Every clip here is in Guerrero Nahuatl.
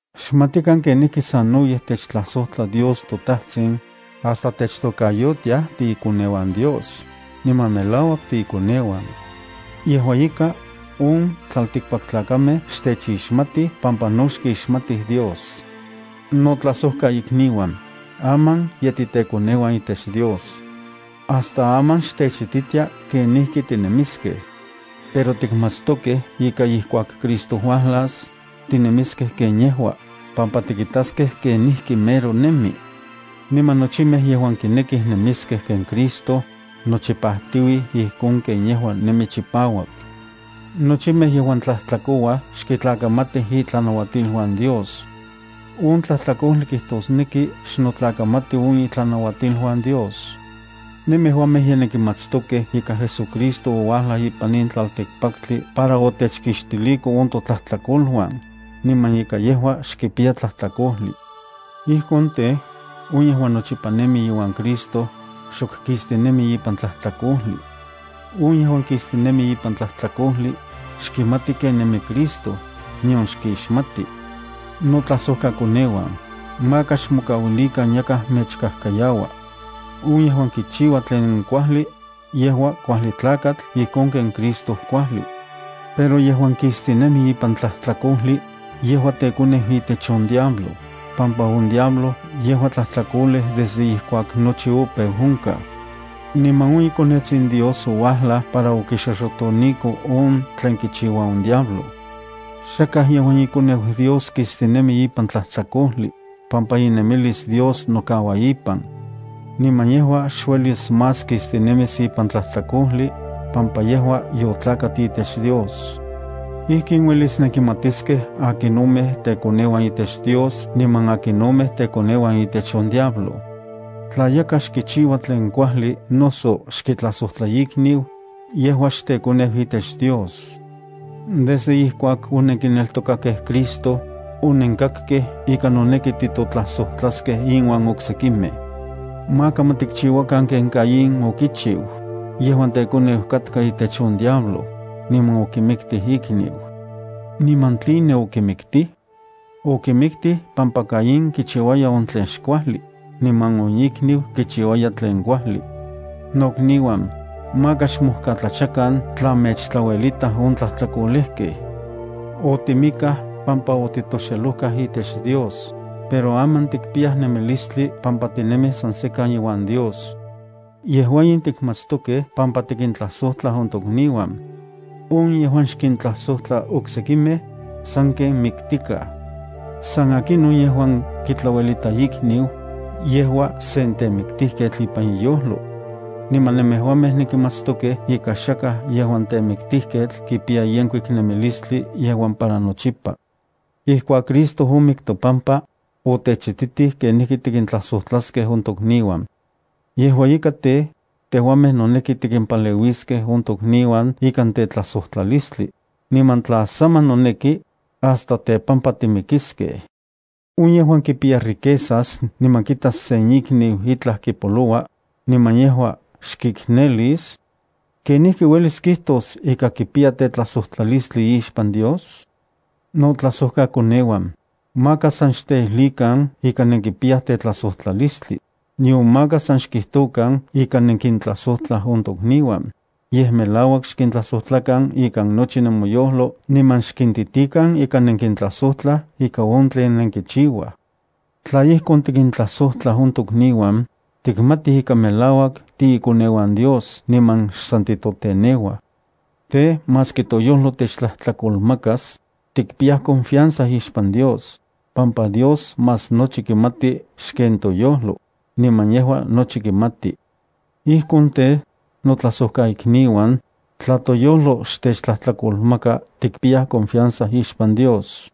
¡Xmatikan kenijki sanoyej techtlajsojtla Dios toTajtsin, hasta techtokayotiaj tiikoneuan Dios, niman melauak tiikoneuan! Yejua ika, on tlaltikpaktlakamej xtechixmatij pampa no xkixmatij Dios. Notlajsojkaikniuan, aman ye titekoneuan itech Dios. Hasta aman xtechititia kenijki tinemiskej. Pero tikmatstokej ika ijkuak Cristo uajlas, tinemiskej ken yejua, pampa tikitaskej kenijki mero nemi. Niman nochimej yejuan kinekij nemiskej ken Cristo, nochipajtiuij ijkon ken yejua nemi chipauak. Nochimej yejuan tlajtlakouaj xkitlakamatij itlanauatiluan Dios. On tlajtlakojli kijtosneki xnotlakamati on itlanauatiluan Dios. Nemejuamej ye nenkimatstokej ika JesuCristo ouajlaj ipan in tlaltikpaktli para otechkixtiliko on totlajtlakoluan, niman ika yejua xkipiya tlajtlakojli. Ijkon tej, on yejuan nochipa nemi iuan Cristo, xok kistinemi ipan tlajtlakojli. On yejuan kistinemi ipan tlajtlakojli, xkimati ken nemi Cristo, nion xkixmati. Notlajsojkakoneuan, maka xmokauilikan yakaj mechkajkayaua. On yejuan kichiua tlen kuajli, yejua kuajli tlakatl ijkon ken Cristo kuajli. Pero yejuan kistinemi ipan tlajtlakojli, yejua tekoneu itech on diablo, pampa on diablo yejua tlajtlakolej desde ijkuak nochi opeu onkaj. Niman on iKonetsin Dios ouajlaj para okixoxotoniko on tlen kichiua on diablo. Xakaj yejuan ikoneu Dios kistinemi ipan tlajtlakojli, pampa inemilis Dios nokaua ipan. Niman yejua xuelis más kistinemis ipan tlajtlakojli, pampa yejua yotlakat itech Dios. Ijkin uelis nenkimatiskej akinomej tekoneuan itech Dios niman akinomej tekoneuan itech on diablo. Tla yakaj xkichiua tlen kuajli noso xkitlajsojtla ikniu, yejua xtekoneu itech Dios. Desde ijkuak onenkineltokakej Cristo, onenkakkej ika noneki titotlajsojtlaskej inuan oksekimej. Maka ma tikchiuakan ken Caín okichiu, yejuan tekoneu katka itech on diablo, niman okimiktij ikniu. ¿Niman tline okimiktij? Okimiktij pampa Caín kichiuaya on tlen xkuajli, niman on ikniu kichiuaya tlen kuajli. Nokniuan, maka xmojkatlachakan tla mechtlauelitaj on tlajtlakolejkej. Otimikaj pampa otitoxelojkaj itech Dios, pero aman tikpiyaj nemilistli pampa tinemij san sekan iuan Dios. Yejua in tikmatstokej pampa tikintlajsojtlaj on tokniuan. On yejuan xkintlajsojtla oksekimej, sanken miktikaj. San akinon yejuan kitlauelita ikniu, yejua sen temiktijketl ipan iyojlo. Niman nemejuamej nenkimatstokej ika xakaj yejuan temiktijketl kipiya yenkuik nemilistli yejuan para nochipa. Ijkuak Cristo omik topampa, otechititij kenijki kijtosneki tikintlajsojtlaskej on tokniuan. Yejua ika tej, tejuamej noneki tikimpaleuiskej on tokniuan ikan tetlajsojtlalistli, niman tla saman noneki, hasta tepampa timikiskej. On yejuan kipiya riquezas niman kitas sen ikniu itlaj kipoloua, niman yejua xkiknelis, ¿kenijki uelis kijtos ika kipiya tetlajsojtlalistli ixpan Dios? Notlajsojkakoneuan, maka san xteijlikan ika nenkipiyaj tetlajsojtlalistli, nion maka san xkijtokan ika nenkintlajsojtlaj on tokniuan, yej melauak xkintlajsojtlakan ikan nochi nemoyojlo niman xkintitikan ika nenkintlajsojtlaj ika on tlen nenkichiuaj. Tla ijkon tikintlajsojtlaj on tokniuan, tikmatij ika melauak tiikoneuan Dios niman xsan titoteneuaj. Tej, maski toyojlo techtlajtlakolmakas, tikpiyaj confianza ixpan Dios, pampa Dios más nochi kimati xken toyojlo, niman yejua nochi kimati. Ijkon tej, notlajsojkaikniuan, tla toyojlo xtechtlajtlakolmaka, tikpiyaj confianza ixpan Dios.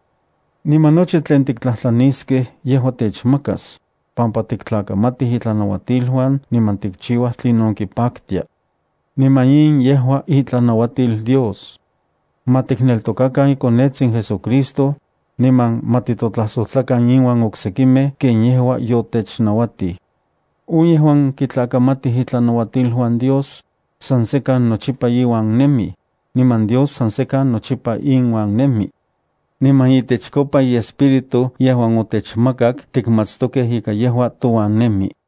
Niman nochi tlen tiktlajtlaniskej yejua techmakas, pampa tiktlakamatij itlanauatiluan niman tikchiuaj tlinon kipaktia. Niman in yejua itlanauatil Dios: “Ma tikneltokakan iKonetsin JesuCristo, niman ma titotlajsojtlakan inuan oksekimej ken yejua yotechnauatij.” On yejuan kitlakamatij itlanauatiluan Dios, san sekan nochipa iuan nemij, niman Dios san sekan nochipa inuan nemi. Niman itechkopa iEspíritu yejuan otechmakak tikmatstokej ika yejua touan nemi.